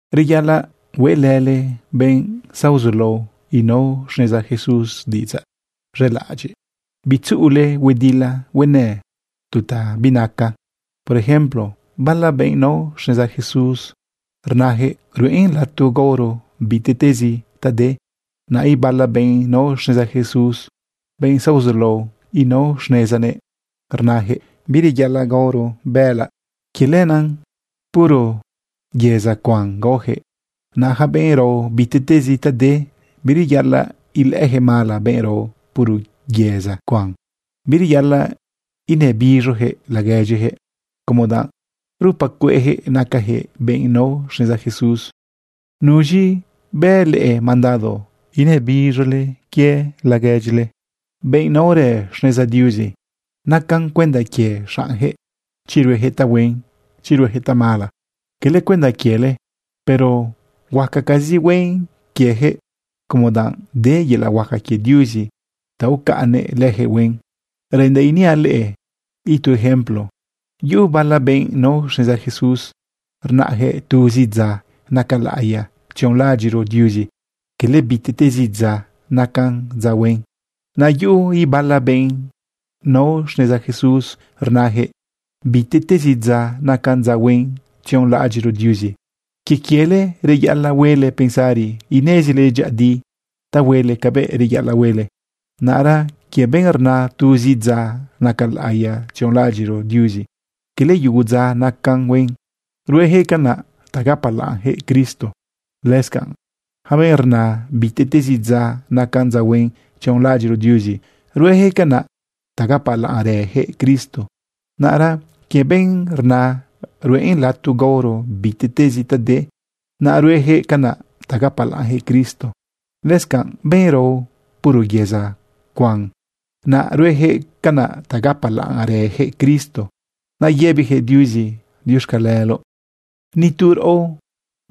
Reyaꞌalaꞌ hueꞌlële benꞌ zaozulao inao xneza Jesús diꞌidzaꞌ z̃elaꞌadyiꞌ. Bitzuꞌule huedila huenë tu ta binaca. Por ejemplo, bala benꞌ nao xneza Jesús rnajëꞌ ruꞌen lato gaoro bitiꞌtezi ta de. Naꞌ ibala benꞌ nao xneza Jesús, benꞌ zaozulao inao xnezanëꞌ, rnajëꞌ bireyaꞌalaꞌ gaoro bëꞌëlaꞌ. Quie lenaꞌ puro yëza cuan gaojëꞌ. Naꞌ yaca benꞌ rao bitiꞌtezi ta de, bireyaꞌalaꞌ ilëꞌëyaquëꞌ mala benꞌ rao puro yëza cuan. Bireyaꞌalaꞌ inëbiz̃oyaquëꞌ laguedyijëꞌ como danꞌ rupa cueꞌjëꞌ nacajëꞌ benꞌ nao xneza Jesús. ¿Nuz̃i bë leꞌe mandado inëbiz̃ole laguedyile, benꞌ naorë xneza Diuzi? Nacan cuenda quie xaꞌnjëꞌ chi ruejëꞌ tahuen, chi ruejëꞌ tamala, cala cuenda quiele. Pero huacacazi huen quiejëꞌ, como danꞌ de yelaꞌ huaca quie Diuzi ta ucaꞌnnëꞌ lëjëꞌ huen. Reꞌendaꞌ iniaꞌ leꞌe itu ejemplo: Yuꞌu bala benꞌ nao xneza Jesús rnayaquëꞌ tuzi dza naca laꞌiya tzionꞌlaꞌadyiꞌro Diuzi, cala bitiꞌtezi dza nacan dza huen. Naꞌ yuꞌu ibala benꞌ nao xneza Jesús rnajëꞌ bitiꞌtezi dza nacan dza huen tzionꞌlaꞌadyiꞌro Diuzi. Quie quiele reyaꞌalaꞌ huele pensari inezile dyëꞌëdi ta huele cabëꞌ reyaꞌalaꞌ huele. Naꞌra quie benꞌ rna tuzi dza naca laꞌiya tzionlaꞌadyiꞌro Diuzi, cala yugu dza nacan huen, ruejëꞌ canaꞌ ta gapalaꞌnjëꞌ Cristo. Lëscanꞌ yaca benꞌ rna bitiꞌtezi dza nacan dza huen tzionlaꞌadyiꞌro Diuzi, ruejëꞌ canaꞌ ta gapalaꞌnrëjëꞌ Cristo. Naꞌra quie benꞌ rna ruꞌen lato gaoro bitiꞌtezi ta de, naꞌ ruejëꞌ canaꞌ ta gapalaꞌnjëꞌ Cristo. Lëscanꞌ benꞌ rao puro yëza cuen, naꞌ ruejëꞌ canaꞌ ta gapalaꞌnrëjëꞌ Cristo, naꞌ yëbijëꞌ Diuzi diuxcaleloꞌ. Ni tu raꞌo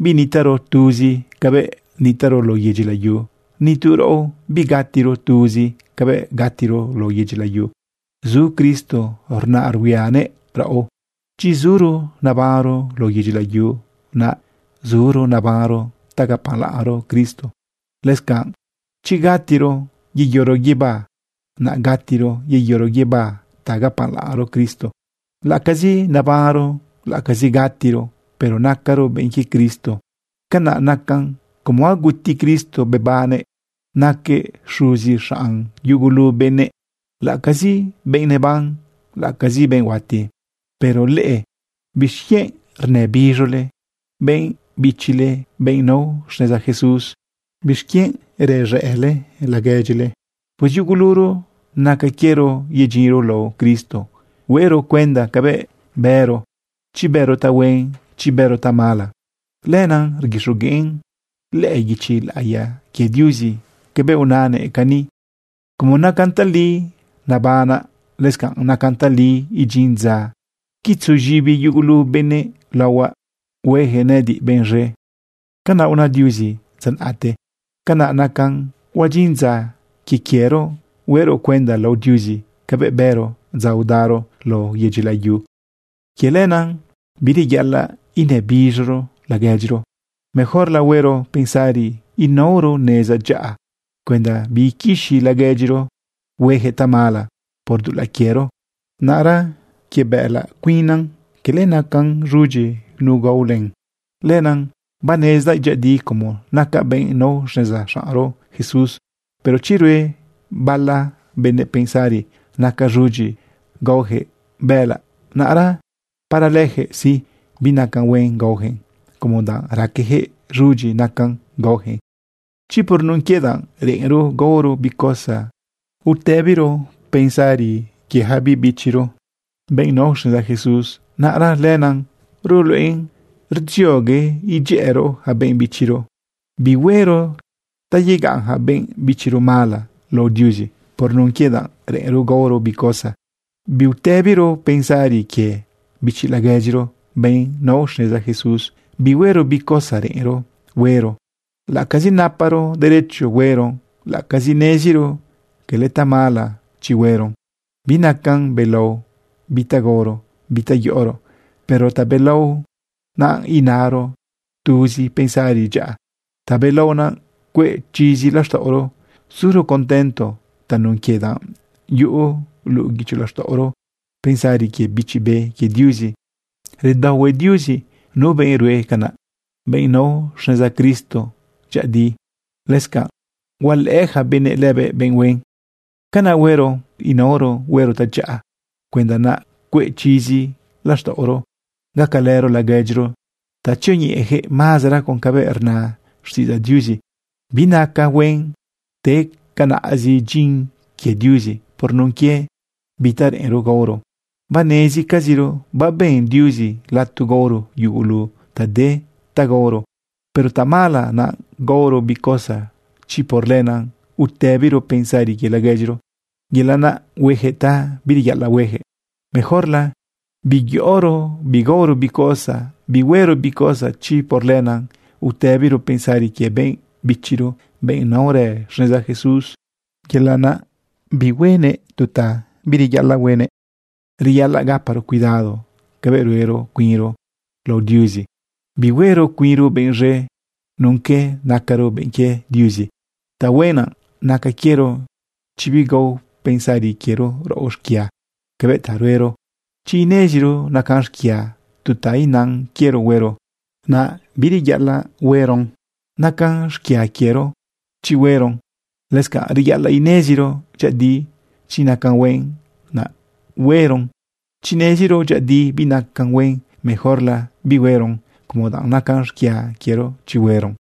binitaꞌro tuzi cabëꞌ nitaꞌro lao yedyi layu. Ni tu raꞌo bigatiro tuzi cabëꞌ gatiro lao yedyi layu. Zu Cristo rnaꞌ ruhuianëꞌ raꞌo. Chi zuro nabanro lao yedyi layu, naꞌ zuro nabanro ta gapalaꞌnro Cristo. Lëscanꞌ chi gatiro yeyoro guibá, naꞌ gatiro yeyoro guibá ta gapalaꞌnro Cristo. Laꞌacazi nabanro, laꞌacazi gatiro, pero nacaro benꞌ quie Cristo. Canaꞌ nacan como aguti Cristo bebannëꞌ naquëꞌ xuzi xaꞌn yugulu benëꞌ, laꞌacazi benꞌ neban, laꞌacazi benꞌ huati. Pero leꞌe, ¿bixquienꞌ rnëbiz̃ole benꞌ bichile benꞌ nao xneza Jesús? ¿Bixquienꞌ rez̃ëꞌle laguedyile? Pues yuguluro naca quiero yedyinro lao Cristo huero cuenda cabëꞌ bëro, chi bëro tahuen, chi bëro tamala. Lenaꞌ rguixogueꞌn lëꞌë guichi laꞌiya quie Diuzi cabëꞌ unanëꞌ cani: Como nacan tali nabanaꞌ, lëscanꞌ nacan tali idyin dza quitzu z̃ibi yugulu benëꞌ laohuaꞌ, hueyaquëꞌ nëꞌëdiꞌ benꞌ z̃e. Canaꞌ una Diuzi dza naꞌte. Canaꞌ nacan huadyin dza quie quiero huero cuenda lao Diuzi cabëꞌ bëro dza udaro lao yedyi layu. Quie lenaꞌ bireyaꞌalaꞌ inëbiz̃oro laguedyiro. Mejorla huero pensari inaoro neza dyaꞌa cuenda biiquixi laguedyiro huejëꞌ tamala por dulaꞌ quiero. Naꞌra quie bëꞌëlaꞌ, cala cuinnan nacan z̃udyi nu gao len. Lenaꞌ banezdaꞌ dyëꞌëdi como nacaꞌ benꞌ nao xneza xaꞌnro Jesús. Pero chi rue bala benëꞌpensari naca z̃udyi gaojëꞌ bëꞌëlaꞌ, naꞌra para lëjëꞌ sí, binacan huen gaojëꞌn, como danꞌ raquejëꞌ z̃udyi nacan gaojëꞌn. Chi por nun quie danꞌ reꞌenro gaoro bi cosa utëbiro pensari quie yaca biꞌ bichiro, benꞌ nao xneza Jesús, naꞌra lenaꞌ ruluꞌen rdziogue idyëꞌëro yaca benꞌ bichiro. Bihuero ta yegaꞌn yaca benꞌ bichiro mala lao Diuzi por nun quie danꞌ reꞌenro gaoro bi cosa. Biutëbiro pensari quie bichi laguedyiro, benꞌ nao xneza Jesús. Bihuero bi cosa reꞌenro huero, laꞌacazi naparo derecho hueron, laꞌacazi neziro cala tamala chi hueron. Binacan belao bi ta gaoro, bi ta yoꞌoro. Pero tabelao naꞌ inaro tuzi pensari dyaꞌa. Tabelao naꞌ cueꞌ chizi laxtaꞌoro, suro contento tanun quie danꞌ yuꞌu luꞌu guicho laxtaꞌoro pensari quie Bichi Be quie Diuzi. Redaohue Diuzi nu benꞌ rue canaꞌ, benꞌ nao xneza Cristo dyëꞌëdi. Lëscanꞌ hualëꞌë yaca benëꞌ lëbëꞌ benꞌ huen. Canaꞌ huero seguir inaoro huero tadyaꞌa cuenda naꞌ cueꞌ chizi laxtaꞌoro, gacalëro laguedyiro ta tzioñeꞌejëꞌ mazara con cabëꞌ rna xtiꞌidzaꞌ Diuzi. Binaca huen te canaꞌzi dyin quie Diuzi por nun quie bi ta reꞌenro gaoro. Banezcaziro baben Diuzi lato gaoro yugulu ta de ta gaoro. Pero tamala naꞌ gaoro bi cosa chi por lenaꞌ utëbiro pensari quie laguedyiro yelaꞌ naꞌ huejëꞌ ta bireyaꞌalaꞌ huejëꞌ. Mejorla biyoꞌoro bigaoro bi cosa, bihuero bi cosa chi por lenaꞌ utëbiro pensari quie benꞌ bichiro, benꞌ naorë xneza Jesús, yelaꞌ naꞌ huenëꞌ tu ta bireyaꞌalaꞌ huenëꞌ. Reyaꞌalaꞌ gaparo cuidado cabëꞌ ruero cuinro lao Diuzi. Bihuero cuinro benꞌ z̃e nun que nacaro benꞌ quie Diuzi. Tahuen naꞌ naca quiero chi bigao pensari quiero raꞌo xquia cabëꞌ ta ruero. Chi ineziro nacan xquia tu ta inan quiero huero, naꞌ bireyaꞌalaꞌ hueron. Nacan xquia quiero chi hueron. Lëscanꞌ reyaꞌalaꞌ ineziro dyëꞌëdi chi nacan huen, naꞌ hueron. Chi neziro dyëꞌëdi binacan huen, mejorla bihueron como danꞌ nacan xquia quiero chi hueron.